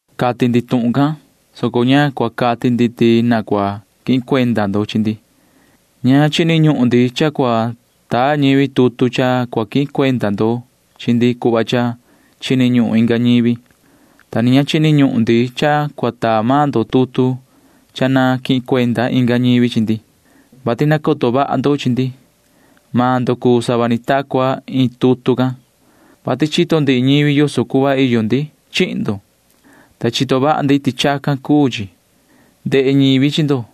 Cati ndi tuhun can, soco ña cua cati ndi ti na cua quihin cuenda ndo chi ndi. Ña chini ñuhun ndi cha cua taa ñivi tutu cha cua quihin cuenda ndo chi ndi cuhva cha chini ñuhun inga ñivi, ta ni ña chini ñuhun ndi cha cua taa maan ndo tutu cha na quihin cuenda inga ñivi chi ndi, vati nacoto vaha ndo chi ndi. Maan ndo cuu sava ni ta cua iin tutu can, vati chito ndihi ñivi yoso cuhva iyo ndi chihin ndo, ta chito vaha ndi ti chacan cuu chi. Ndehe ñivi chi ndo,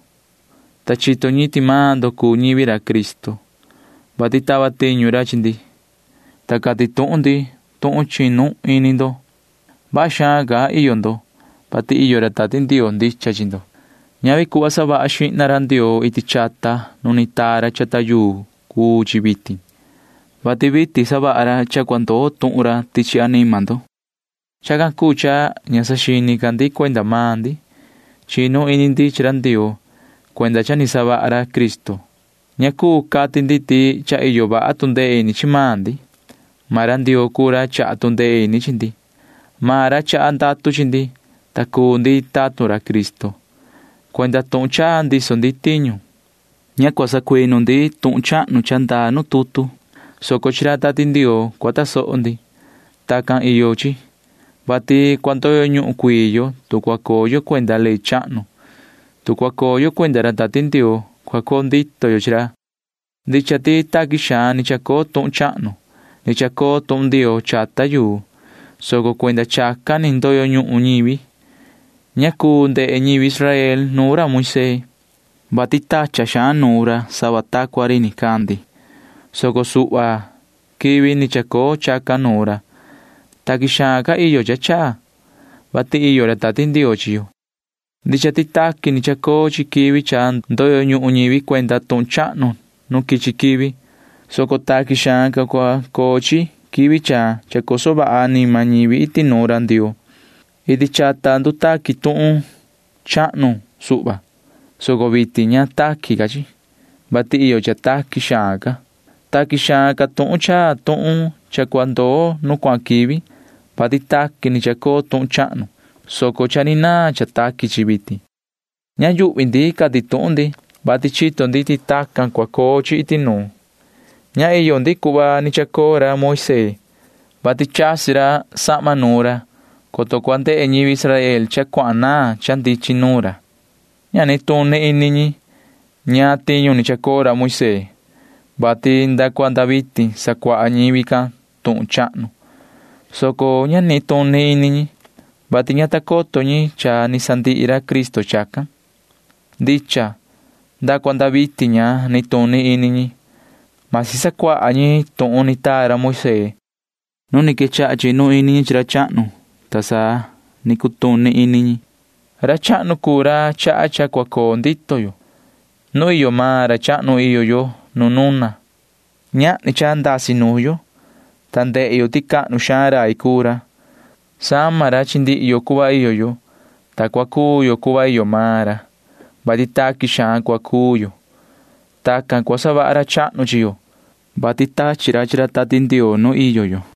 ta chito ñi ti maan ndo cuu ñivi ra Cristo, vati tava tiñu ra chi ndi, ta cati tuhun ndi tuhun chinu ini ndo. Vaha xaan ca iyo ndo, vati iyo ra Tati Ndioo ndicha chi ndo. Ñavi cuhva savaha xihna ra Ndioo iti chata nu ni taa ra chata yuu cuu chi vitin, vati vitin savaha ra cha cua ndoo tuhun ra chi anima ndo. Chacan cuu cha ña saxini ca ndi cuenda maan ndi. Chínu ini ndi chi ra Ndioo cuenda cha ni savaha ra Cristo. Ña cuu cati ndi ti cha iyo vaha tu ndee ini chi maan ndi. Maan ra Ndioo cuu ra chaha tu ndee ini chi ndi. Maan ra chaha ndatu chi ndi, ta cuu ndi tatun ra Cristo. Cuenda tuhun chaa ndiso ndi tiñu. Ña cua sacuinu ndi tuhun chahnu cha ndaa nu tutu, soco chi ra Tati Ndioo cua tasoho ndi. Tacan iyo chi, vati cua ndoyo ñuhun cuii yo, tu cua coo yo cuenda ley chahnu. Tu cua coo yo cuenda ra Tati Ndioo, cua coo ndito yo chi ra. Ndicha ti taqui xaan ni chacoo tuhun chahnu. Ni chacoo tuhun Ndioo chata yuu, soco cuenda chacan ni ndoyo ñuhun ñivi. Ña cuu ndehe ñivi Israel nuun ra Moisee, vati tachan xaan nuun ra sava ta cua ri nicandi, soco suhva quivi ni chacoo chacan nuun ra. Taqui xaan ca iyo cha chaa, vati iyo ra Tati Ndioo chi yo. Ndicha ti taqui ni chacoo chi quivi cha ndoyo ñuhun ñivi cuenda tuhun chahnu nu quichi quivi, soco taqui xaan ca cua coo chi quivi cha chacoso vaha anima ñivi iti nuun ra Ndioo. Iti chata ndutaqui tuhun chahnu suhva, soco vitin ña taqui ca chi, vati iyo cha taqui xaan ca. Taqui xaan ca tuhun chaa tuhun cha cua ndoo nu cuahan quivi, vati taqui ni chacoo tuhun chahnu, soco cha ni naan cha taqui chi vitin. Ña yuhvi ndi cati tuhun ndi, vati chito ndi ti tacan cua coo chi iti nuun. Ña iyo ndi cuhva ni chacoo ra Moisee, vati chasi ra sahma nuun ra, coto cua ndehe ñivi Israel cha cuahan naan cha ndichin nuun ra. Ña nituni ini ñi [ñaan tiñu ni chacoo ra Moisee], vati nda cua nda vitin sacuaha ñivi can tuhun chahnu, soco ña nituni ini ñi, vati ña ta coto ñi cha cha ni sandihi ra Cristo chacan. Ndicha. Nda cua nda vitin ña nituni ini ñi―masi sacuaha ñi tuhun ni taa ra Moisee. Nu ni quechaha chinu ini ñi chi ra chahnu, ta sa ni cutuni ini ñi. Ra chahnu cuu ra chaha cha cua coo ndito yo. Nuun iyo maan ra chahnu iyo yo nu nuna. Ñahni cha ndasi nuun yo, ta ndehe yo ti cahnu xaan rai cuu ra. Sama ra chi ndihi yo cuhva iyo yo, ta cua cuu yo cuhva iyo maan ra, vati taqui xaan cua cuu yo. Tacan cua savaha ra chahnu chi yo, vati tachi ra chi ra Tati Ndioo nu iyo yo.